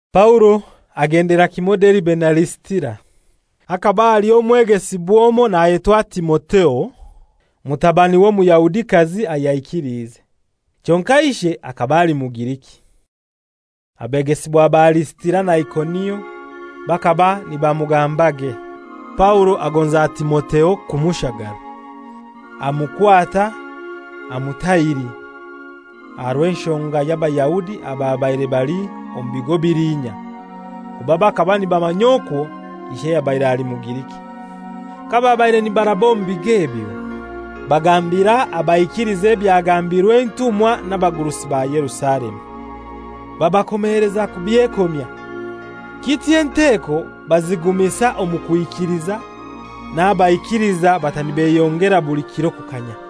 Paulo agendera kimoi Deribe na Lisitira. Hakaba haliyo omwegesibwa omoi nayetwa Timotheo, mutabani w'Omuyahudikazi ayaikiliize. Kyonkai ishe akaba ali Mugiriki. Abegesibwa ba Lisitira na Ikonio bakaba nibamugambage. Paulo agonza Timotheo kumushagara. Amukwata amutahiri aha rw'enshonga y'Abayahudi ababaire bali omu bigo biliinya, kuba bakaba nibamanya okwo ishe yabaire ali Mugiriki. Kababaire nibaraba omu bigo ebyo, bagambira abaikiliza ebyagambirwe entumwa n'abagurusi ba Yerusalemu; babakomeleza kubyekomya. Kityo enteko bazigumisa omu kwikiliza, n'abaikiliiza bata nibeyongera buli kiro kukanya.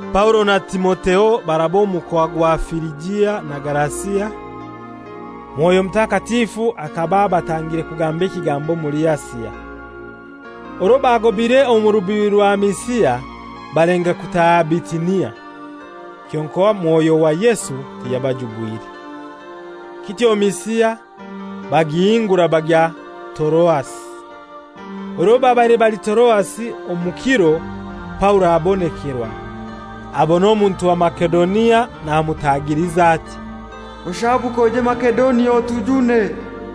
Paulo na Timotheo baraba omu mukoa gwa Firijia na Galasia; Mwoyo Mutakatifu akaba abatangire kugamba ekigambo omuli Asia. Orwo bagobaire omu rubibi rwa Misia balenga kutaaha Bitinia, kyonkai Mwoyo wa Yesu tiyabajubwire. Kityo Misia bagihingura bagya Toroasi. Orwo babaire bali Toroasi omu kiro Paulo abonekerwa: abona omuntu wa Masedonia namutagiliza ati, «Oshaabuke oije Masedonia otujune.»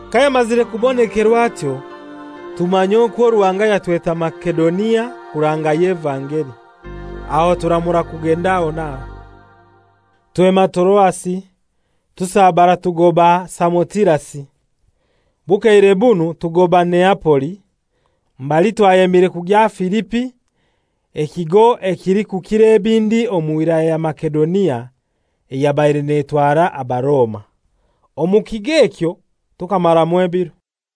Kayamazire kubonekerwa atyo, tumanya okwo Ruhanga yatweta Masedonia kurangayo evangeli, aho turamura kugenda aho n'aho. Twema Toroasi tusabara tugoba Samotirasi, bukeire bunu tugoba Neapoli mbali twayemire kugya Filipi ekigo ekilikukira ebindi omu wilaya ya Masedonia eyabaire netwarwa Abaroma. Omu kigo ekyo tukamaramu ebiro.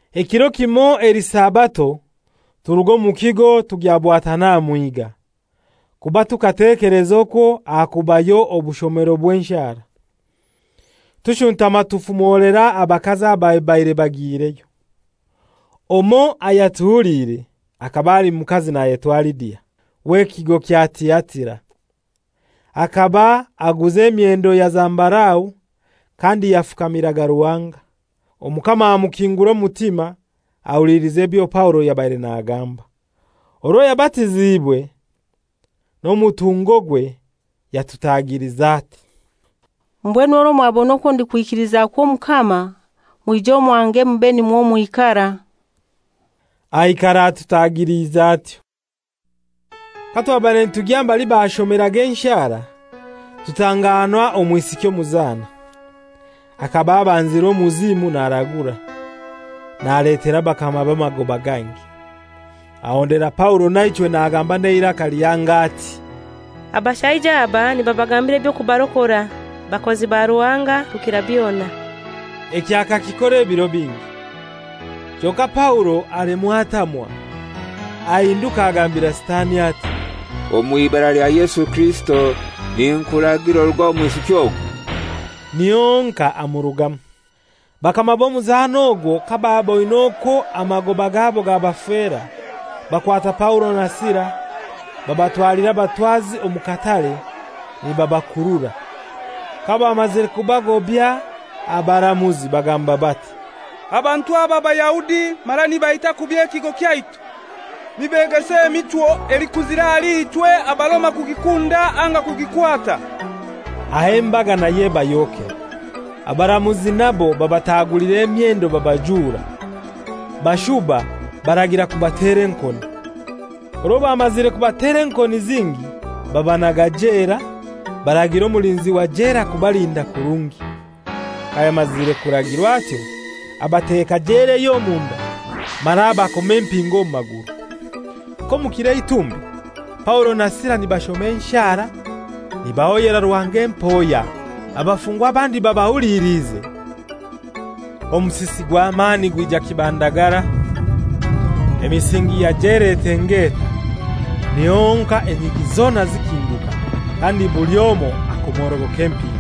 Ekiro kimoi eli Sabato turuga omu kigo tugya bwatana aha mwiga, kuba tukatekeleza okwo hakubayo obushomero bw'enshara. Tushuntama tufumolera abakazi ababaire bagiireyo. Omoi ayatuhuliire akaba ali mukazi nayetwa Lidia, w'ekigo kya Tiatira. Akaba aguza emyendo ya zambarau kandi yafukamiraga Ruhanga. Omukama amukingura omutima ahuliliza ebyo Paulo yabaire nagamba. Orwo yabatiziibwe n'omutungogwe, yatutagiliza ati, «Mbwenu orwo mwabona okwo ndikwikilizakwo Omukama, mwije omwange mube nimwo mwikara.» Aikara atutagiliize atyo. Katwabaire nitugya mbali bashomeraga enshara, tutanganwa omwisiki omuzana. Akaba abanzirwe omuzimu naragura, naletera bakamabe amagoba gangi. Ahondera Paulo naichwe nagamba n'eiraka lihango ati, «Abashaija aba nibabagambira eby'okubarokora; bakozi ba Ruhanga Rukirabyona.» Ekyo akakikora ebiro bingi. Kyonkai Paulo alemwa atamwa. Ahinduka agambira Sitani ati, «Omw'Ibara lya Yesu Kirisito ninkuragira oruge omu mwisiki ogu.» Niho honkai amurugamu. Bakama b'omuzana ogwo kabaaboine okwo amagoba gabo gabafera, bakwata Paulo na Sila babatwalira abatwazi omu katare nibabakurura. Kabamazire kubagobaya abaramuzi bagamba bati, «Abantu aba Bayahudi mara nibaita kubi ekigo kyaitu. Nibegesa emichwo elikuzira ahali ichwe Abaroma kugikunda anga kugikwata.» Aho embaga nayo ebayokera. Abaramuzi nabo babatagulira emyendo babajura, bashuba baragira kubatera enkoni. Orwo bamazire kubatera enkoni zingi babanaga jela, baragira omulinzi wa jela kubalinda kurungi. Kayamazire kuragirwa atyo abateka jela ey'omunda mara abakoma empingo omu maguru. Nk'omu kiro eitumbi Paulo na Sila nibashoma enshara, nibahoyera Ruhanga empoya, abafungwa abandi babahuliliize, omusisi gw'amani gwija kibandagara. Emisingi ya jela etengeeta, niho honkai enyigi zona zikinguka, kandi buli omoi akomorogoka empingo.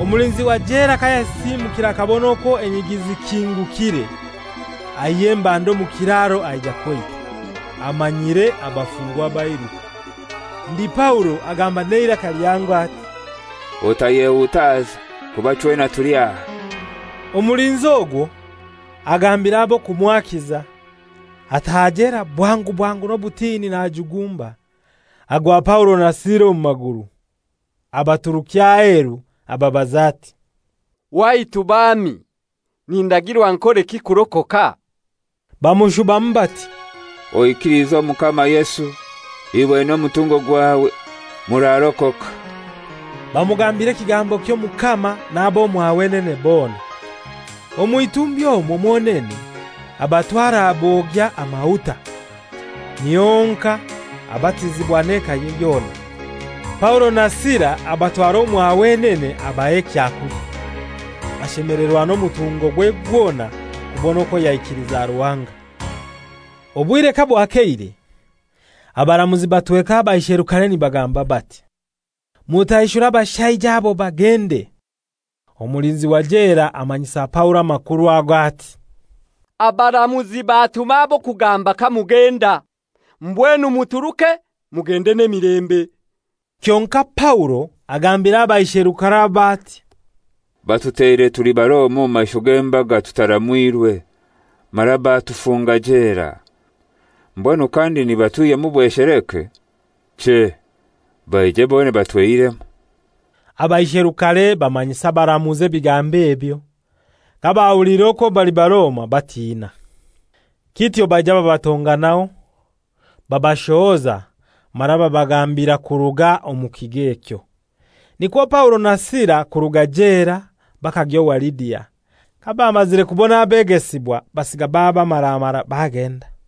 Omulinzi wa jela kayasisiimukire akabona okwo enyigi zikingukire, aihya embanda omu kiraro aija kweita, amanyire abafungwa bairuka. Ndi Paulo agamba n'eiraka lihango ati, «Otayehutaza kuba chwena tuli aha.» Omulinzi ogwo agambira ab'okumwakiza, ataaha jela bwangu bwangu n'obutini najugumba, agwa Paulo na Sila omu maguru. Abaturukya aheru ababaza ati, «Waitu baami, nindagirwa nkoleki kurokoka?» Bamushubamu bati, «Oikilize Omukama Yesu, iwe n'omutungo gwawe, murarokoka.» Bamugambira ekigambo ky'Omukama n'ab'omwa wenene bona. Omw'itumbi omwo mwonene abatwara abogya amahuta, niho honkai abatizibwa n'ekaye yona. Paulo na Sila abatwara omwa wenene abaha ekyakulya, ashemelerwa n'omutungogwe gwona kubona okwo yaikiliza Ruhanga. Obwire kabwakeire, abaramuzi batweka abaisherukare nibagamba bati, «Mutaishure abashaija abo bagende.» Omulinzi wa jela amanyisa Paulo amakuru ago ati, «Abaramuzi batuma ab'okugamba kamugenda. Mbwenu muturuke mugende n'emilembe.» Kyonkai Paulo agambira abaisherukare abo ati, «Batuteire tuli Baroma omu maisho g'embaga tutaramwirwe, mara batufunga jela. Mbwenu kandi nibatwihyamu bwesheleke? Chei! Baije bonene batweihiremu.» Abaisherukare bamanyisa abaramuzi ebigambo ebyo. Kabahuliire okwo bali Baroma batina. Kityo baija babatonganaho. Babashohoza mara babagambira kuruga omu kigo ekyo. Nikwo Paulo na Sila kuruga jela bakagya owa Lidia. Kabamazire kubona abegesibwa basiga babamaramara bagenda.